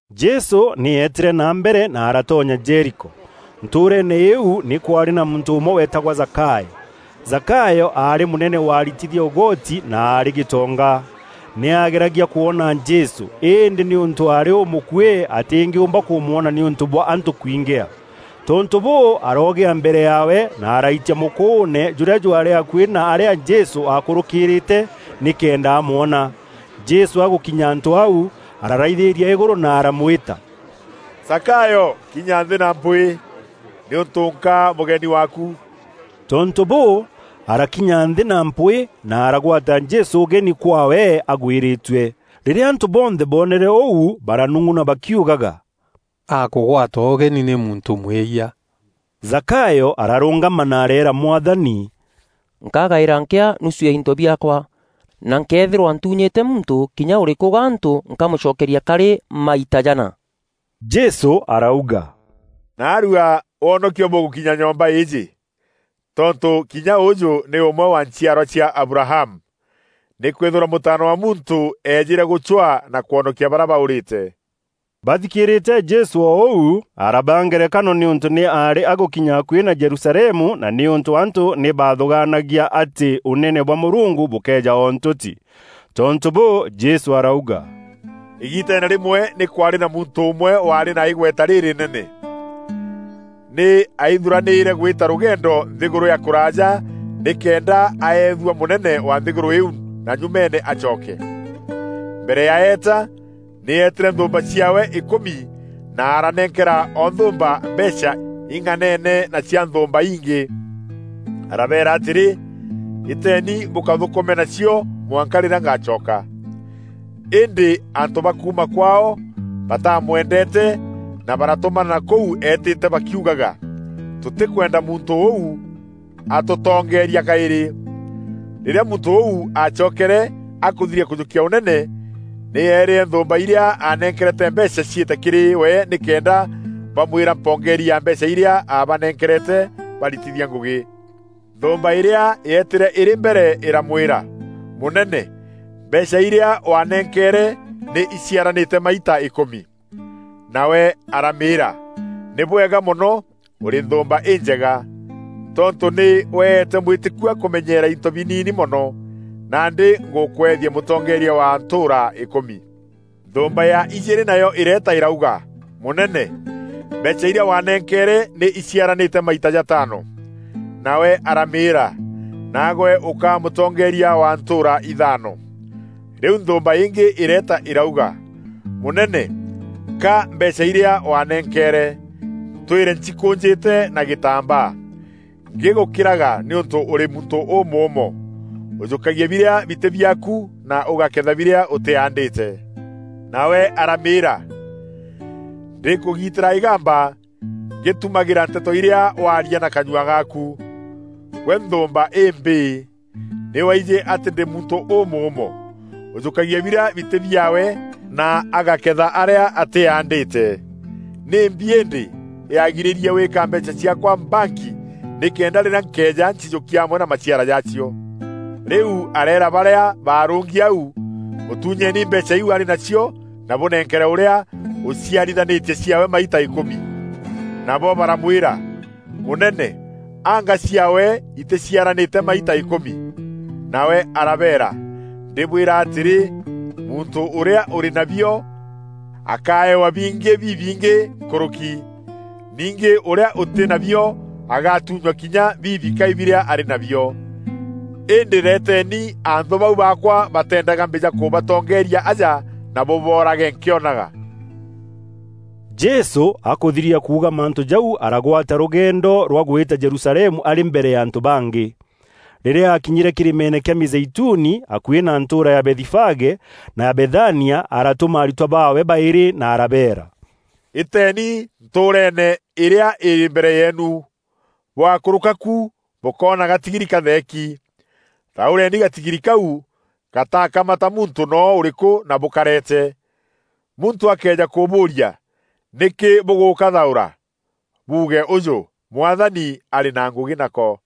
Jesû nî eetîre na mbere na aratonya Jeriko. Ntûûreene îû, nî kwaarî na muntû ûmwe weetagwa Zakayo. Zakayo aarî mûnene wa aritithia ûgoti na aarî gîtonga. Nî aageragia kwona Jesû, îndî nîûntû aarî ûmûkûî atîngîûûmba kûmwona nîûntû bwa antû kwingîa. Tontû bûû, aroogîa mbere yaawe na araitia mûkûûne jûrîa jwaarî akuî na arîa Jesû aakûrûkîrîîte, nîkenda amwona. Jesû agûkinya antû au, araraithîîria îgûrû na aramwîta, “Zakayo kinya nthî na mpwîî, nîûntû nkaa mûgeni waaku.” Tontû bûû, arakinya nthî na mpwîî na aragwata Jesû ûgeni kwaawe agwîrîtue. Rîrîa antû bonthe boonere ûu baranung'una bakiugaga, “Akûgwatwa ûgeni nî muntû mwîyia.” Zakayo ararûngama na areera Mwathani, “Nkagaîra nkîa nusu ya into biaakwa, na nkëethîrwa ntûnyîte muntû kinya ûrîkû gantû, nkamûcokeria karî maita jana.” Jesû arauga, “Naarua wonokio bûgûkinya nyomba îîjî, tontû kinya ûûjû nî ûmwe wa nchiarwa cia Abrahamu. Nîkwîthîrwa Mûtaana wa Muntû eejîre gûcwaa na kwonokia barîa baûrîte.” Bathikîîrîte Jesû o ûu, arabaa ngerekano nîûntû nî aarî agûkinya akuî na Jerusalemu na nîûntû antû nî baathûgaanagia atî Ûnene bwa Mûrungu bûkeeja o ntûti. Tontû bûû, Jesû arauga, “Îgiiteene rîmwe nî kwaarî na muntû ûmwe waarî na îgweta rîrînene. Nî aithuranîîre gwîta rûgendo nthîgûrû ya kûraaja nîkenda aeethua mûnene wa nthîgûrû îîu na nyumeene acoke. Mbere ya eeta, nî eetîre nthûûmba ciaawe îkûmi na aranenkera o nthûûmba mbeecha ing'anene na cia nthûûmba ingî. Arabeera atîrî, ‘Îteeni bûkathûkûme nacio mwanka rîrîa ngacoka.’ Îndî antû ba kuuma kwaao batamwendeete na baratûmana kûu eetîte bakiugaga, ‘Tûtîkwenda muntû ûu atûtongeeria kaîrî.’ “Rîrîa muntû ûu aacokere akûthiria kûjûkia ûnene, nî eerîre nthûûmba irîa aanenkerete mbeecha ciîte kîrî we nîkenda bamwîra mpongeeri ya mbeecha irîa aabanenkerete baaritithia ngûgî. Nthûûmba îrîa yeetîre îrî mbere îramwîra, ‘Mûnene, mbeecha irîa waanenkeere nî iciaranîte maita îkûmi.’ Nawe aramîîra, ‘Nî bwega mono, ûrî nthûûmba înjega! Tontû nî weete mwîtîkua kûmenyeera into biniini mono, nandî ngûkwethia mûtongeeria wa ntûûra îkûmi.’ Nthûûmba ya ijîîrî nayo îreeta îrauga, ‘Mûnene, mbeecha irîa waanenkeere nî iciaranîte maita jataano.’ Nawe aramîîra, ‘Naagwe ûkaa mûtongeeria wa ntûûra ithaano.’ Rîu nthûûmba îngî îreeta îrauga, ‘Mûnene, ka mbeecha irîa waanenkeere, ntwîre ncikûûnjîte na gîtambaa, ngîgûkîraga nîûntû ûrî muntû ûmûûmo. Ûjûkagia birîa bitî biaaku na ûgakeetha birîa ûtîaandîte.’ Nawe aramîîra, ‘Ndîkûgiitîra îgamba ngîtumagîra nteto irîa waarîa na kanyua gaaku. Gwe nthûûmba îmbîî! Nî waijî atî ndî muntû ûmûûmo, ûjûkagia birîa bitî biaawe na agakeetha arîa ntîaandîte. Nîmbi îndî yaagirîrie wîîka mbeecha ciaakwa banki nîkenda rîrîa nkeeja ncijûkia amwe na maciara jaacio?’ Rîu areera barîa baarûngi au, ‘Mûtûnyeeni mbeecha îîu arî nacio na bûnenkere ûrîa ûciarithanîtie ciaawe maita îkûmi.’ Nabo baramwîra, ‘Mûnene, anga ciaawe itîciaranîte maita îkûmi!’ Nawe arabeera, ‘Ndîbwîra atîrî, muntû ûrîa ûrî nabio, akeewa bingî bibingî nkûrûki. Ningî Ûrîa ûtî nabio agatunywa kinya bibikai birîa arî nabio. Îndî reeteni anthû bau baakwa bateendaga mbîja kûbatongeeria aja na bûboorage nkîonaga.’” Jesû akûthiria kuuga mantû jau aragwata rûgeendo rwa gwîta Jerusalemu arî mbere ya antû bangî. Rîrîa aakinyîre kîrîmeene kîa Mîzeituni, akuî na ntûûra ya Bethifage na ya Bethania, aratûma aritwa baawe baîrî, na arabeera, “Îteeni ntûûreene îîrîa îrî mbere yeenu. Bwakûrûka ku bûkoona gatigiri katheeki. Thaûreeni gatigiri kau gataakamata muntû noo ûrîkû na bûkareete. Muntû akëeja kûbûûria, ‘Nîkî bûgûkathaûra?’ Buuge ûjû, ‘Mwathani arî na ngûgî nako.’”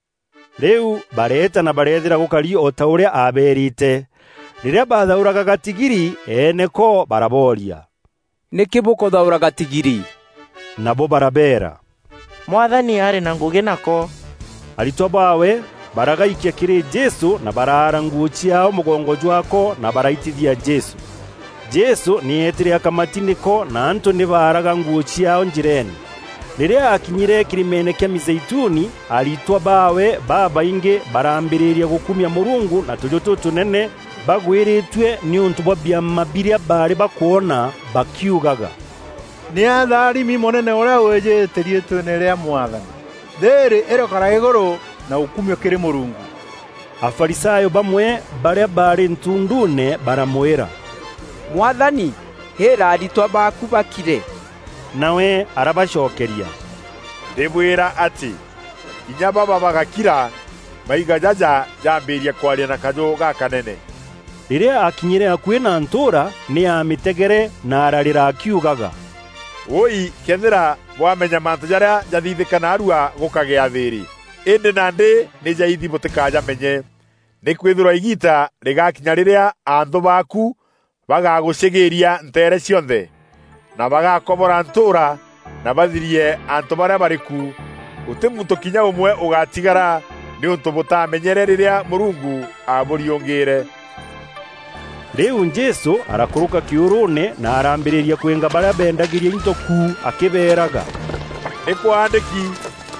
Rîu bareeta na bareethîra gûkari o ta ûrîa aabeerîte. Rîrîa baathaûraga gatigiri, eene ko barabooria, “Nîkî bûkûthaûra gatigiri?” Nabo barabeera, “Mwathani arî na ngûgî nako.” Aritwa baawe baragaikia kîrî Jesû na baraara nguû ciaao mûgongo jwaako na baraitithia Jesû. Jesû nî eetîre akamati nîko na antû nî baaraga nguû ciaao njîreene. Rîrîa akinyîîre kîrîmeene kîa Mîzeituni, aritwa baawe babaingî baraambîrîria gûkumia Mûrungu na tûjû tûtûnene bagwîrîtue nîûntû bwa biama birîa baarî bakwona, bakiugaga, “Nî atharimi Mûnene ûrîa wîjîte riîtweene rîa Mwathani! Thîîrî îrokara îgûrû na ûkumio kîrî Mûrungu!” Afarisayo bamwe barîa baarî ntunduune baramwîra, “Mwathani, îîra aritwa baaku bakire.” Nawe arabacokeria, “Ndîbwîra atî, kinya baba bagakira, maiga jaja jaambîria kwaria na kajû gakanene.” Rîrîa aakinyîre akuî na ntûûra, nî aamîtegere na ararîra akiugaga, “Wûûi këethîra bwamenya mantû jarîa jathithîka naarua gûkagîa thîîrî! Îndî nandî nî jaithi bûtîkajamenye. Nîkwîthîrwa îgiita rîgaakinya rîrîa anthû baaku bagagûcîgîria nteere cionthe, na bagakobora ntûûra na bathirie antû barîa barî ku. Gûtî muntû kinya ûmwe ûgatigara nîûntû bûtamenyere rîrîa Mûrungu aabûriûngîîre.” Rîu Jesû arakûrûka kîûrûûne na araambîrîria kwînga barîa beendagîria into ku, akîberaga, “Nî kwaandîki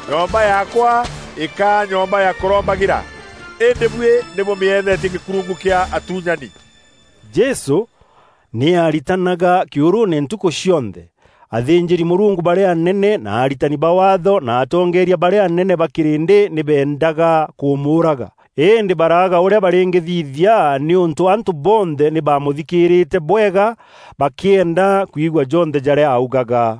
‘Nyomba yaakwa îkaa nyomba ya kûrombagîra,’ îndî buî nî bûmîethetie gîkurungu kîa atûnyani.” Jesû nî aaritanaga kîûrûûne ntukû cionthe. Athînjîri mûrungu barîa anene na aritani ba Waatho na atongeeria barîa anene ba kîrîndî nî beendaga kûmûûraga, îndî baraaga ûrîa barîngîthithia nîûntû antû bonthe nî baamûthikîîrîte bwega bakîenda kwigua jonthe jarîa augaga.